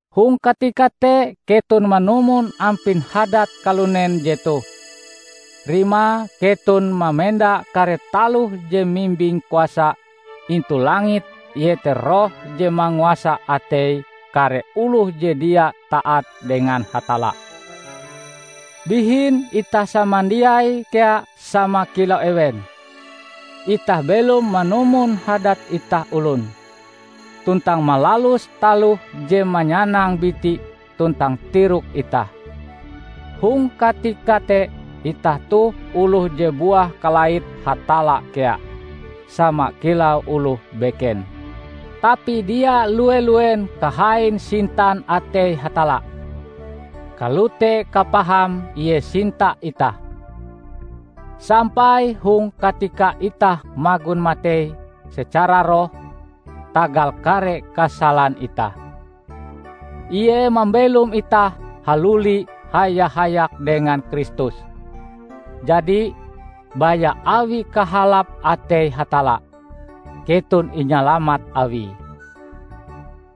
Hong katika te keton manumon ampin hadat kalunen jetoh; rimae keton mamenda kare taloh je mimbing kuasa intu langit iete roh je manguasa atei kare oloh je dia taat dengan Hatalla. Bihin itah samandiai kea sama kilau ewen; itah belom manumon hadat itah olon, tuntang malalus taloh je manyanang biti tuntang tirok itah. Hong katika te itah toh oloh je buah kalait Hatalla kea, sama kilau oloh beken. Tapi dia lue-luen kahain sintan atei Hatalla! Kalote kapahame Ie sinta itah, sampai hong katika itah magon matei secara roh tagal kare kasalan itah, Ie mambelom itah haluli haya-hayak dengan Kristus. Jadi, baya awi kahalap atei Hatalla, keton inyalamat Awie.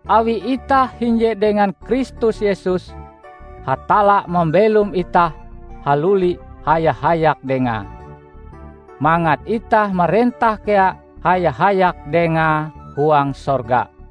Awi itah hinje dengan Kristus Yesus, Hatalla mambelom itah haluli haya-hayak Dengae, mangat itah marentah kea haya-hayak Dengae huang sorga.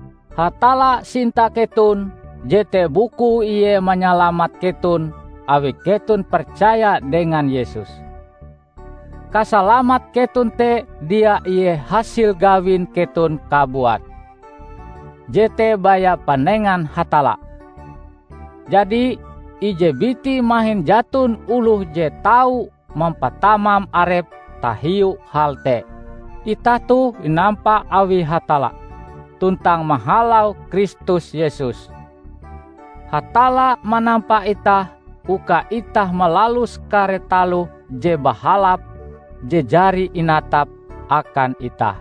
Hatalla sinta keton, jete bukue Ie manyalamat keton awi keton percaya dengan Yesus. Kasalamat keton te dia ie hasil gawin keton kabuat. Jete baya panengan Hatalla. Jadi, ije biti mahin jaton oloh je tau mampatamam arepe tahiu hal te. Itah toh inampa awi Hatalla, tuntang mahalau Kristus Yesus, Hatalla manampa itah uka itah malalus kare taloh je bahalap je jari inatape akan itah.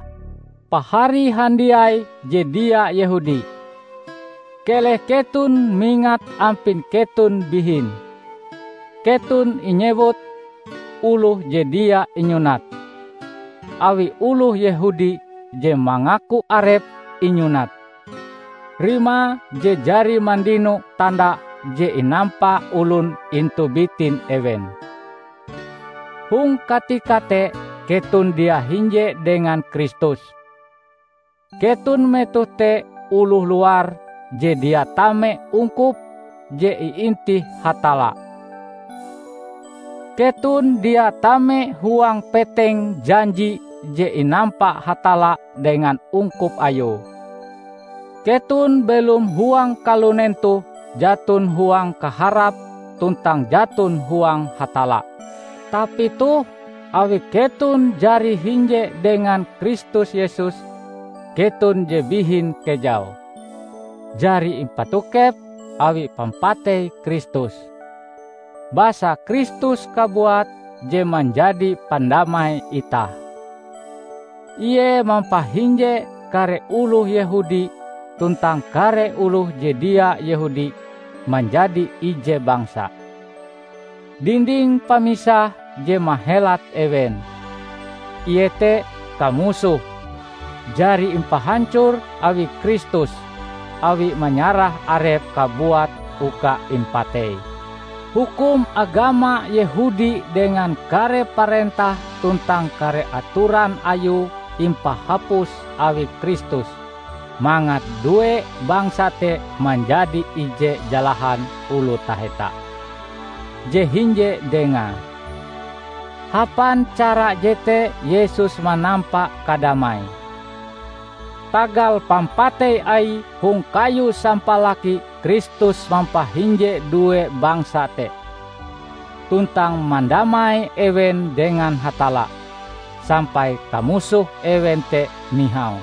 Pahari handiai je dia Yehudi! Keleh keton mingat ampin keton bihin: Keton inyewut "oloh je dia inyunat", awi oloh Yehudi je mangaku arepe inyunat (rimae je jari mandino tanda je inampa olon intu bitin ewen). Hong katika te keton dia hinje dengan Kristus, keton metoh te oloh luar je dia tame ungkup je iintih Hatalla. Keton dia tame huang peteng janji je inampa Hatalla dengan ungkup Ayue. Keton belom huang kalunen toh jaton huang kaharap tuntang jaton huang Hatalla. Tapi toh, awi keton jari hinje dengan Kristus Yesus, keton je bihin kejau, jari impatokep awi pampatei Kristus. Basa Kristus kabuat je manjadi pandamai itah. Ie mampahinje kare oloh Yehudi tuntang kare oloh je dia Yehudi manjadi ije bangsa. Dinding pamisah je mahelat ewen, iete kamusoh, jari impahancor awi Kristus awie manyarah Arepe kabuat uka impatei. Hukum agama Yehudi dengan kare parentah tuntang kare atoran ayue impahapus awi Kristus mangat due bangsa te manjadi ije jalahan oloh taheta, je hinje Dengae. Hapan cara jete Yesus manampa kadamai. Tagal pampatei Aie hong kayu sampalaki Kristus mampahinje due bangsa te, tuntang mandamai ewen dengan Hatalla, sampai kamusoh ewen te nihau.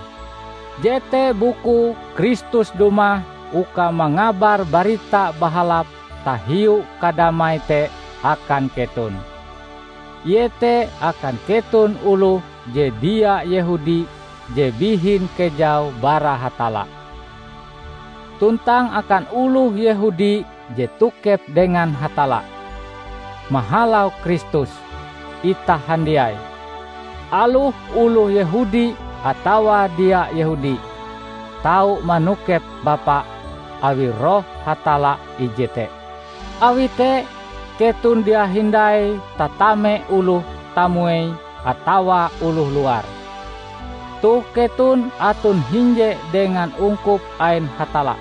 Jete bukue Kristus dumah uka mangabar Barita Bahalap tahiu kadamai te akan keton; iete akan keton oloh je dia Yehudi je bihin kejau bara Hatalla, tuntang akan oloh Yehudi je tokep dengan Hatalla. Mahalau Kristus, itah handiai -- aloh oloh Yehudi atawa dia Yehudi -- tau manokep Bapa awi Roh Hatalla ije te. Awi te, keton dia hindai tatame oloh tamuei atawa oloh luar. Toh keton aton hinje dengan ungkup ain Hatalla.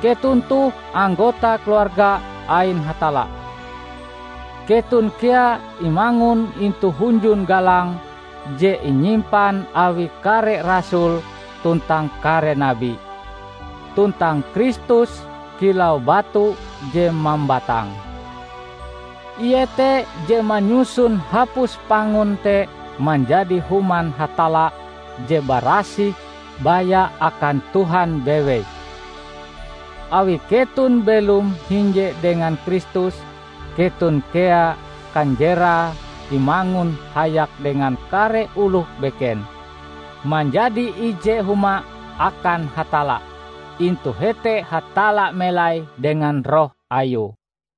Keton toh anggota keluarga ain Hatalla. Keton kea imangun intu hunjun galang je inyimpan awi kare rasul tuntang kare nabi, tuntang Kristus kilau batu je mambatang. Ie te je manyusun hapus pangun te manjadi Human Hatalla je barasih baya akan Tuhan bewei. Awi keton belom hinje dengan Kristus, keton kea kanjerae imangun hayak dengan kare oloh beken manjadi ije huma akan Hatalla; intu hete Hatalla melai dengan Roh Ayue.